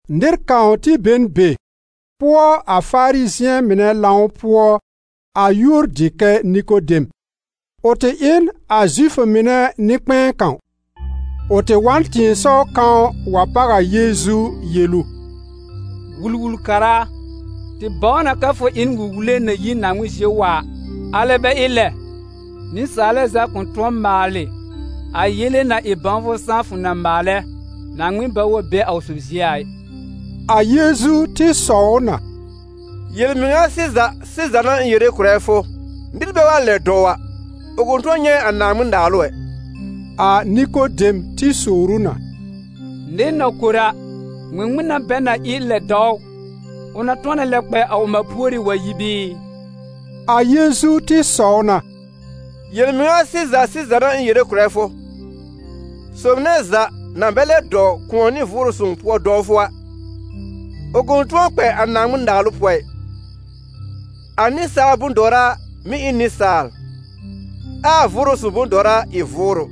Nɩr kãw tɩ be n be, pʋɔ a Farizɩ̃ɛ mɩnɛ lãw pʋɔ, a yúor dɩ kɛ Nikodem; ʋ tɩ ɩ n a Zifʋ mɩnɛ nɩ-kpɛ̃ɛ kãw. Ʋ tɩ wa n tɩ̃ɩsɔw kãw wa páw a Yeezu yel ʋ: «Wul-wul-kara a, tɩ bãw na kɛ fʋ ɩ n wul-wule na yi Naaŋmɩn zie wa a; alɛ bɛ ɩ lɛ, nɩsaalɛ za kʋ̃ tʋ̃ɔ maalɩ a yele-na-ɩ-bãwfʋ-sãá fʋ na maalɛ, Naaŋmɩn bɛ wa be a ʋ sob zie a ɩ.» A Yeezu tɩ sɔw ʋ na: «Yel-mɩŋa sɩza sɩza n'a ɩ̃ yere kʋ̀rɛ fʋ: nɩr bɛ wa lɛb dɔw a, ʋ kʋ̃ tʋ̃ɔ nyɛ̃ a Naaŋmɩn-Naalʋ ɛ.» A Nikodem tɩ sowr ʋ na: «Nɩr na kor a, ŋmɩŋmɩn n'a bɛ na ɩ lɛb dɔw ʋ? Ʋ na tʋ̃ɔ na lɛb kpɛ a ʋ mã púorí wa yi bɩɩ?» A Yeezu tɩ sɔw na: «Yel-mɩŋa sɩza sɩza n'a ɩ̃ yere kʋ̀rɛ fʋ: sob nɛ za na bɛ lɛb dɔw kʋ̃ɔ nɩ Vʋʋrʋ Sõw pʋɔ dɔwfʋ a, ʋ kʋ̃ tʋ̃ɔ kpɛ a Naaŋmɩn-Naalʋ pʋɔ ɩ. A nɩsaal bʋ̃-dɔwra mɩ́ ɩ n nɩsaal, ɛ a Vʋʋrʋ Sõw bʋ̃-dɔwra ɩ vʋʋrʋ.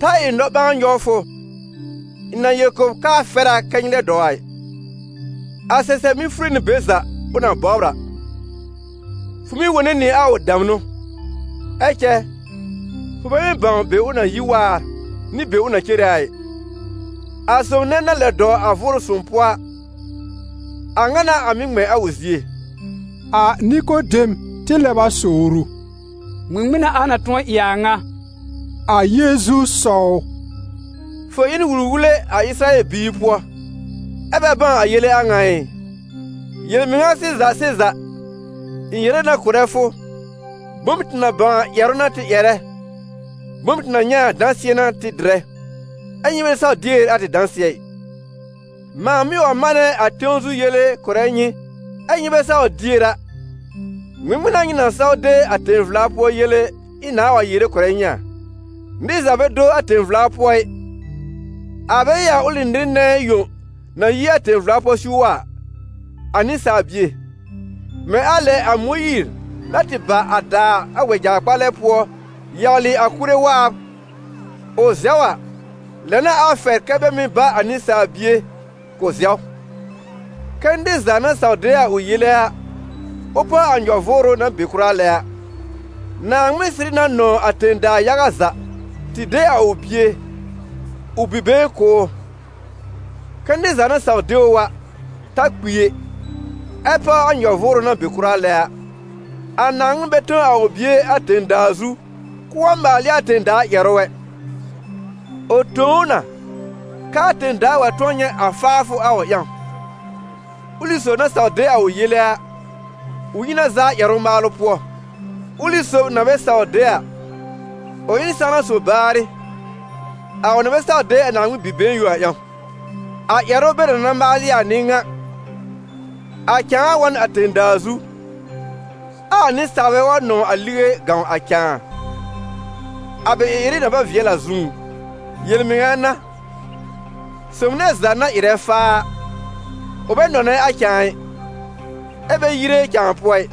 Ta ɩ nɔ-ɓãa nyɔw fʋ, ɩ̃ na yel kʋ̀ b kɛ́ a fɛr kɛ nyɩ lɛb dɔw a ɩ. A sɛsɛb mɩ́ fure nɩ be za ʋ na bɔbr a, fʋ mɩ́ wone nɩ a ʋ damnʋ, ɛ cɛ fʋ bɛ mɩ́ bãw be ʋ na yi waar nɩ be ʋ na cere a ɩ. A sob nɛ na lɛb dɔw a Vʋʋrʋ Sõw pʋɔ a, a ŋa n'a a mɩ́ ŋmɛ̃ a ʋ zie.» A Nikodem tɩ lɛb a sowr ʋ: «Ŋmɩŋmɩn n'a a na tʋ̃ɔ ɩ a a ŋa?» A Yeezu sɔw ʋ: «Fʋ ɩ n wul-wule a Ɩsɩrayɛl biir pʋɔ ɛ bɛ bãw a yele a ŋa ɩ? Yel-mɩŋa sɩza sɩza, ɩ̃ yere na kʋ̀rɛ fʋ: bom tɩ na bãw a ƴɛrʋ n'a tɩ ƴɛrɛ, bom tɩ na nyɛ̃ a dãsɩɛ n'a tɩ dɩrɛ, ɛ nyɩ bɛ saw dier a tɩ dãsɩɛ ɩ. Mãa mɩ́ wa manɛ a tẽw zu yele kʋ̀rɛ nyɩ ɛ́ nyɩ bɛ saw dier a, ŋmɩŋmɩn n'a nyɩ na saw de a tẽ-vla pʋɔ yele ɩ̃ nãà wa yere kʋ̀rɛ nyɩ a? Nɩr za bɛ do a tẽ-vla pʋɔ ɩ, a bɛ ɩ a ʋlɩ nɩr nɛ yõ na yi a tẽ-vla pʋɔ siw wa a, a Nɩsaal Bie. Mɛ̃ a lɛ a Mõyiir na tɩ bà a dàa a wɛja-kpalɛ pʋɔ yawlɩ a kuré waab, ʋ zɛw a, lɛ n'a a fɛr kɛ bɛ mɩ́ ba a Nɩsaal Bie k'ʋ zɛw, kɛ́ nɩr za na saw de a ʋ yele a, ʋ páw a nyɔ-vʋʋrʋ na be kʋra lɛ a. Naaŋmɩn sɩrɩ na nɔ̃w a tẽ-daa yaga za, tɩ de a ʋ Bie, ʋ Bi-been kʋ̀ ʋ, kɛ́ nɩr za na saw de ʋ a, ta kpi ɛ, ɛ páw a nyɔ-vʋʋrʋ na be kʋra lɛ a. A Naaŋmɩn bɛ tõ a ʋ bie a tẽ-daa zu k'ʋʋ wa maal ɩ a tẽ-daa ƴɛrʋ ɛ, ʋ tõ ʋ na kɛ a tẽ-daa wa tʋ̃ɔ nyɛ̃ a faafʋ a ʋ ƴãw. Ʋlɩ sob na saw de a ʋ yele a, ʋ yi na zaa ƴɛrʋ-maalʋ pʋɔ; ʋlɩ sob na bɛ saw de a, ʋ ɩ n sãwna sob baarɩ, a ʋ na bɛ saw de a Naaŋmɩn Bi-been yõ a ƴãw. A ƴɛrʋ bɛ na na maalɩ a n'ɩ ŋa: a cãa wa n a tẽ-daa zu, ɛ a nɩsaalbɛ wa nɔ̃w a lige gãw a cãa, a bɛ ɩ-ɩrɩ na bɛ vɩɛl a zũú. Yel-mɩŋa n'a, sob nɛ za na ɩrɛ faa a, ʋ bɛ nɔ̃nɛ a cãa ɩ, ɛ bɛ yire cãa pʋɔ ɩ,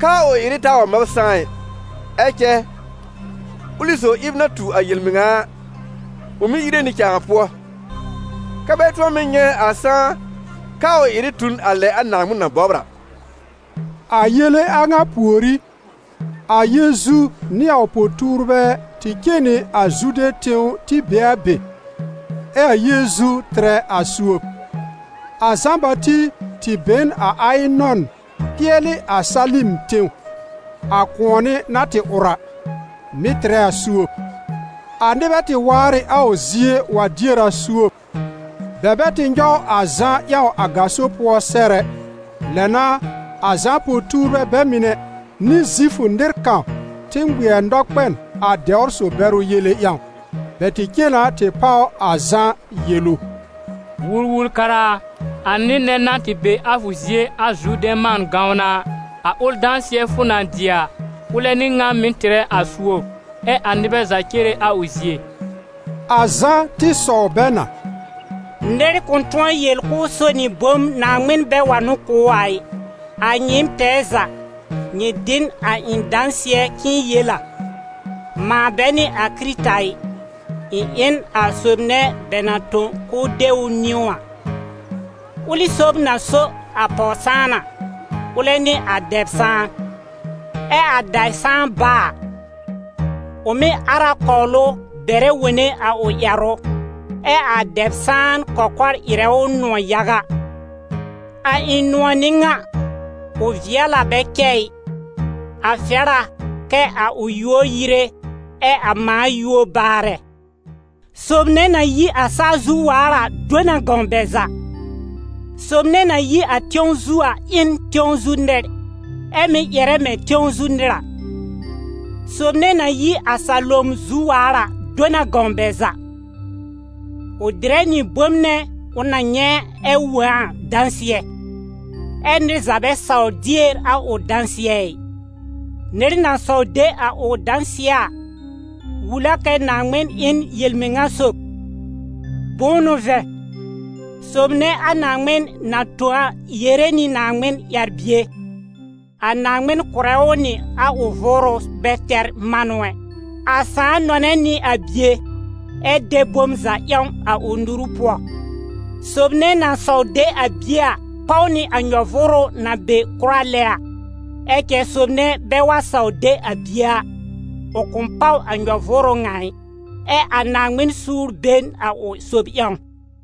kɛ́ a ʋ ɩ-ɩrɩ taa wa mab sãá ɩ. Ɛ cɛ ʋlɩ sob ɩb na tu a yel-mɩŋa a, ʋ mɩ́ yire nɩ cãa pʋɔ, kɛ́ bɛ tʋ̃ɔ mɩ́ nyɛ̃ a sãá kɛ a ʋ ɩ-ɩrɩ tu n a lɛ a Naaŋmɩn na bɔbr a.» A yele a ŋa pùorí, a Yeezu nɩ a ʋ po-tuurbɛ tɩ cen nɩ a Zude tẽw tɩ be a be, ɛ a Yeezu tɩrɛ a suob. A Zã-Bati tɩ be n a Ayɩnɔn pɩɛlɩ a Salim tẽw, a kʋ̃ɔnɩ na tɩ ʋr a, mɩ̀ tɩrɛ a suob. A nɩbɛ tɩ waar ɩ a ʋ zie wa dier a suob. Bɛ bɛ tɩ nyɔw a Zã ƴãw a gaso pʋɔ sɛr ɛ. Lɛ n'a a Zã po-tuurbɛ bɛ mɩnɛ, nɩ Zifʋ nɩr kãw tɩ ŋmɩɛr nɔkpɛn a dɛwr-so-bɛrʋ yele ƴãw. Bɛ tɩ cen na tɩ páw a Zã yel ʋ: «Wul-wul-kara a, a nɩr nɛ na tɩ be a fʋ zie a Zurdɛ̃ man gãwn a, a ʋl dãsɩɛ fʋ na dɩ a, ʋlɛ n'ɩ ŋan mɩ̀ tɩrɛ a suob, ɛ́ a nɩbɛ za cere a ʋ zie.» A Zã tɩ sɔw bɛ na: «Nɩr kʋ̃ tʋ̃ɔ yel k'ʋʋ so nɩ bom Naaŋmɩn bɛ wa n'ʋ kʋ̀ ʋ a ɩ. A nyɩɩm tɛɛ za, nyɩ dɩ n a ɩ̃ dãsɩɛ k'ɩ̃ɩ yel a: ‹Mãa bɛ n'ɩ a Kɩrɩta ɩ. Ɩ̃ ɩ n a sob nɛ bɛ na tõ k'ʋʋ de ʋ niwn a.› Ʋlɩ sob na so a pɔw-sãan a, ʋlɛ n'ɩ a dɛb-sãan. Ɛ a dɛb-sãan bá a, ʋ mɩ́ ar a kɔw ʋ, bɛrɛ wone a ʋ ƴɛrʋ, ɛ́ a dɛb-sãan kɔkɔr ɩrɛ ʋ nʋ̃ɔ̀ yaga. A ɩ̃ nʋ̃ɔ̀ n'ɩ a ŋa, ʋ vɩɛl a bɛ cɛ ɩ. A fɛr a kɛ a ʋ yúor yire, ɛ a mãa yúor baarɛ.» «Sob nɛ na yi a saa zu waar a do na gãw bɛ za. Sob nɛ na yi tẽw zu a ɩ n tẽw zu nɩr, ɛ́ mɩ́ ƴɛrɛ mɛ̃ tẽw zu nɩr a. Sob nɛ na yi a salom zu waar a [do na gãw bɛ za]: ʋ dɩrɛ nɩ a bom nɛ ʋ na nyɛ̃ ɛ wõ a dãsɩɛ, ɛ́ nɩr za bɛ sawr dier a ʋ dãsɩɛ ɩ. Nɩr na saw de a ʋ dãsɩɛ a, wul a kɛ Naaŋmɩn ɩ n yel-mɩŋa sob. Bʋ̃ʋ n'ʋ vɛ̃, sob nɛ a Naaŋmɩn na tõ a yere nɩ a Naaŋmɩn ƴɛr-bie, a Naaŋmɩn kʋ̀rɛ ʋ nɩ a ʋ Vʋʋrʋ bɛ tɛr manʋ ɛ. A Sãà nɔ̃nɛ nɩ a Bie, ɛ de bom za ƴãw a ʋ nuru pʋɔ. Sob nɛ na saw de a Bie a páw nɩ a nyɔ-vʋʋrʋ na be kʋra lɛ a; ɛ cɛ sob nɛ bɛ wa saw de a Bie a, ʋ kʋ̃ páw a nyɔ-vʋʋrʋ ŋa ɩ, ɛ a Naaŋmɩn suur be n a ʋ sob ƴãw.»